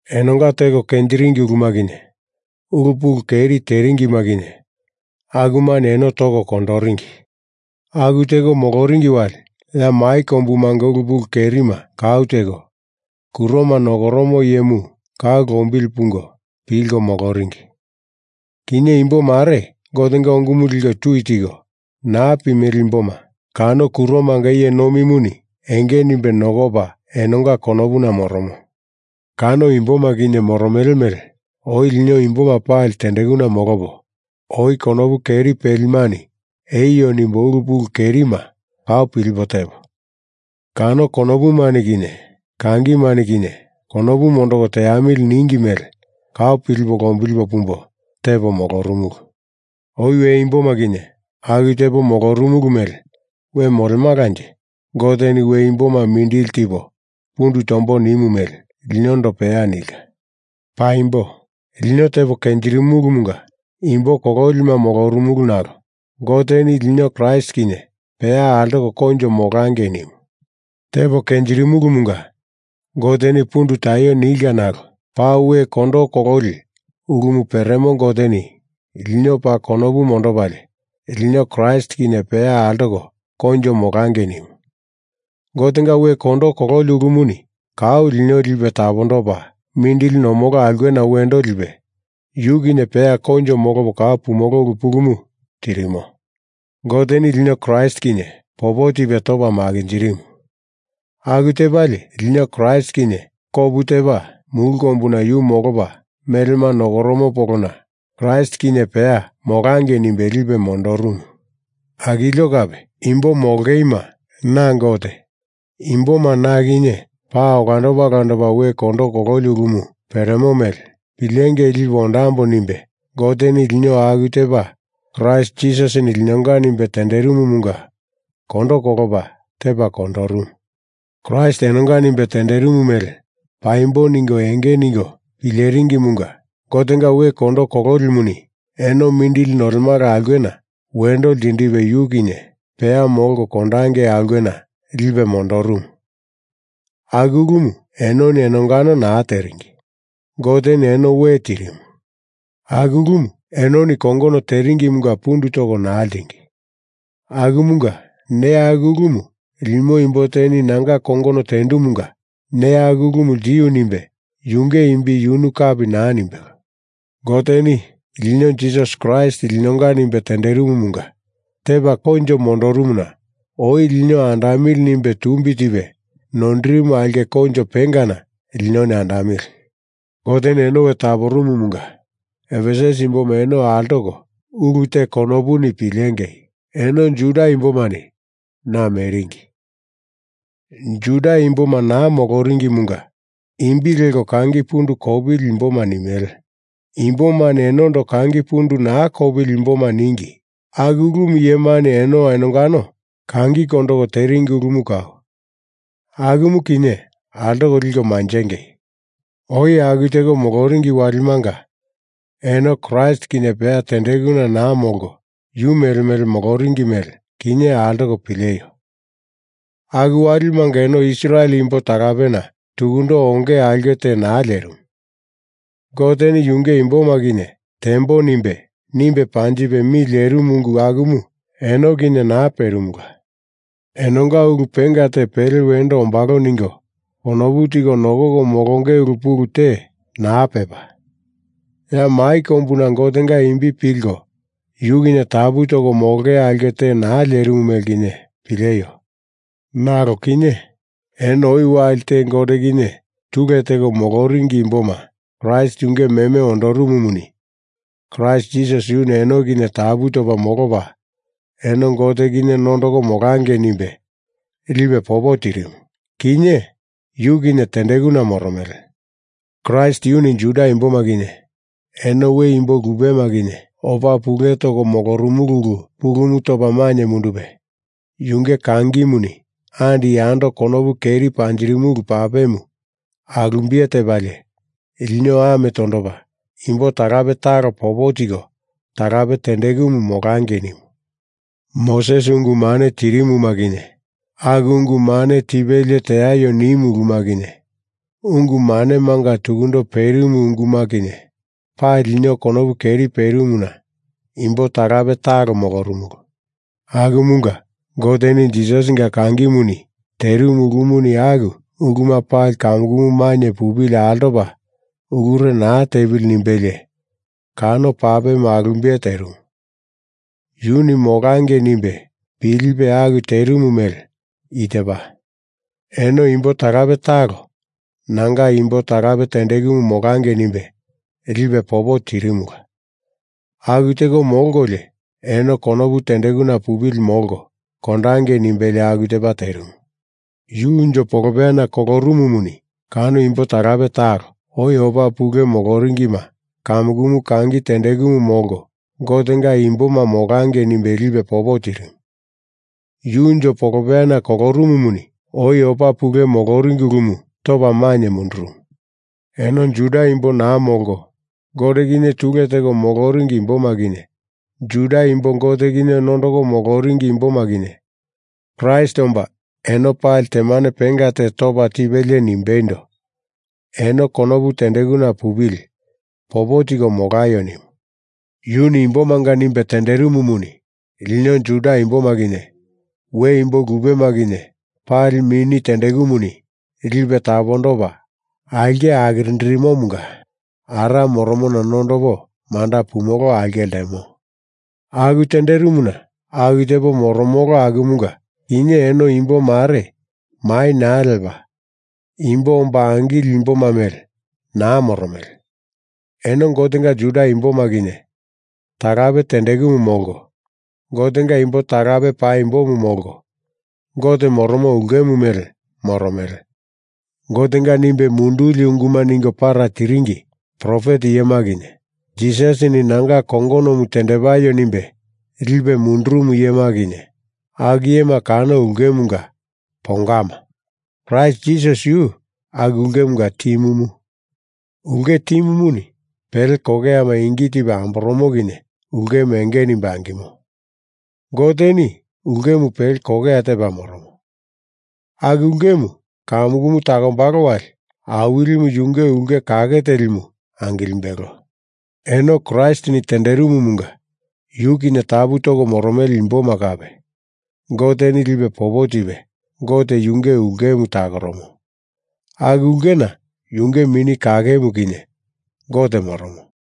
Enonga teko kenjiringi uluma kinye ulu pulu keri teringima kinye akumani eno toko kondoringi. Aku teko moloringi wali ya mai kombumanga ulu pulu kerima kau teko, kuroma nokoromo iyemu kau lombili pungo pilko moloringi. Kinye imbo mare Gotenga ungumu liko tui tiko naa pimele imboma kano kuromanga iye nomimuni enge nimbe nokopa enonga konopuna moromo. Kano imboma kinye moromele mele oi lino imboma pali tendekuna molopo, oi konopu keri pelimani eio nimbo ulu pulu kerima kau pilipo tepo, kano konopumani kinye kangimani kinye konopu mondoko teamili ningi mele kau pilipo lombili pumbo tepo molorumulu. Oi we imboma kinye aku tepo molorumulu mele we molemalanje Goteni we imboma mindili tipo pundu tombo nimu mele linondo peya nilka. Paimbo lino tepo kenjirimulumunga imbo kololima molorumulu nalo Goteni lino Kraist kinye peya altoko koinjo molangei nimu. Tepo kenjirimulumunga Goteni pundu taio nilka nalo paa we kondo kololi ulumu peremo Goteni lino paa konopu mondopalie lino Kraist kinye peya altoko koinjo molangei nimu. Gotenga we kondo kololi ulumuni kau lino lipe tapondopa mindili nomolo aulkena wendo lipe yu kinye peya koinjo molopo kau pumolo ulu pulumu tirimo. Goteni lino Kraist kinye popo tipe topa makinjirimu. Aku tepalie lino Kraist kinye kopu tepa mulu kombuna yu molopa melema nokoromo polona Kraist kinye peya molangei nimbe lipe mondorumu. Akilio kape imbo molongeima na Gote imboma na kinye paa olandopa olandopa we kondo kololi ulumu peremo mele pilengei lipo ondambo nimbe Goteni lino aku tepa Kraist Jisasini linonga nimbe tenderimumunga kondo kolopa tepa kondorumu. Kraist enonga nimbe tenderimu mele paimbo ningo enge ningo pileringimunga Gotenga we kondo kololimuni eno mindili nolemala aulkena wendo ltindipe yu kinye peya molko kondangei aulkena lipe mondorumu. Aku ulumu enoni enongano naa teringi, Goteni eno we tirimu. Aku ulumu enoni kongono teringimunga pundu toko naa ltingi. Akumunga neya aku ulumu limo imbo teni nanga kongono tendumunga neya aku ulumu ltiu nimbe yunge imbi yunu kapi naa nimbelo. Goteni lino Jisasi Kraist linonga nimbe tenderimumunga tepa koinjo mondorumuna oi lino andamili nimbe tumbi tipe noindirimu aulke koinjo pengana linoni andamili. Goteni eno we taporumumunga Efesus imboma eno altoko ulu te konopuni pilengei! Eno Juda imbomani naa meringi. Juda imboma naa moloringimunga imbi leko kangi pundu kopili imboma nimele imbomani enondo kangi pundu naa kopili imboma ningi. Aku ulumu iyemani eno enongano kangikondo teringi ulumu kau. Akumu kinye altoko liko manjengei! Oi aku teko moloringi walimanga eno Kraist kinye peya tendekuna naa molko yu mele mele moloringi mele kinye altoko pileio. Aku walimanga eno Israel imbo talapena tukundo onge aulke te naa lerimu, Goteni yunge imboma kinye tembo nimbe, nimbe panjipe mi lerimu ungu akumu eno kinye naa perimula. Enonga ulu penga te pele wendo ombalo ningo konopu tiko nokoko molonge ulu pulu te naa pepa, ya mai kombuna Gotenga imbi pilko yu kinye tapu toko molonge aulke te naa lerimu mele kinye pileio. Nalo kinye eno oi wali te Gote kinye tule teko moloringi imboma Kraist yunge meme ondorumumuni Kraist Jisasi yuni eno kinye tapu topa molopa eno Gote kinye nondoko molangei nimbe lipe popo tirimu. Kinye Yu kinye tendekuna moromele. Kraist yuni Juda imboma kinye eno we imbo lupema kinye opa pule toko molorumulu ulu pulumu topa mainye mundupe yunge kangimuni andi yando konopu keri panjirimulu papemu alumbiye tepalie lino ame tondopa imbo talape talo popo tiko talape tendekumu molangei nimu. Moses ungu mane tirimuma kinye, aku ungu mane tipelie teaio nimu uluma kinye, ungu manemanga tukundo perimu unguma kinye, pali lino konopu keri perimuna imbo talape talo molorumulu. Akumunga Goteni Jisasinga kangimuni terimu ulumuni aku uluma pali kamukumu mainye pupili altopa ulure naa tepili nimbelie kano papemu alumbiye terimu. Yuni molangei nimbe pilipe aku terimu mele i tepa, eno imbo talape talo nanga imbo talape tendekumu molangei nimbe lipe popo tirimula. Aku teko molkolio eno konopu tendekuna pupili molko kondangei nimbelie aku tepa terimu. Yu unjo polopeyana kolorumumuni kano imbo talape talo oi opa pule moloringima kamukumu kangi tendekumu molko Gotenga imboma molangei nimbe lipe popo tirimu. Yu unjo polopeyana kolorumumuni oi opa pule moloringi ulumu topa mainye mundurumu. Eno Juda imbo naa molko Gote kinye tule teko moloringi imboma kinye, Juda imbo Gote kinye nondoko moloringi imboma kinye Kraist omba eno pali temane penga te topa tipelie nimbeindo, eno konopu tendekuna pupili popo tiko molaio nimu. Yuni imbomanga nimbe tenderimumuni lino Juda imboma kinye we imbo lupema kinye pali Mini tendekumuni lipe tapondopa aulke akirindirimomunga Ara moromona nondopo manda pumolo aulke ltemo. Aku tenderimuna aku tepo moromolo akumunga kinye eno imbo mare mai naa lepa imbo omba angileli imboma mele naa moromele. Eno Gotenga Juda imboma kinye talape tendekumu molko, Gotenga imbo talape paimbomu molko, Gote moromo ulkemu mele moromele. Gotenga nimbe munduli unguma ningo para tiringi profet iyema kinye, Jisasini nanga kongonomu tendepaio nimbe lipe mundurumu iyema kinye, aku iyema kano ulkemunga pongama. Kraist Jisasi yu aku ulkemunga timumu. Ulke timumuni pele kokeyama ingi tipe amboromo kinye ulkemu enge nimbe angimo. Goteni ulkemu pele kokeya tepa moromo. Aku ulkemu kamukumu takombalo wali Awilimu yunge ulke kake telimu angilimbelo. Eno Kraistini tenderimumunga yu kinye tapu toko moromele imboma kape Goteni lipe popo tipe Gote yunge ulkemu takoromo, aku ulkena yunge Mini Kakemu kinye Gote moromo.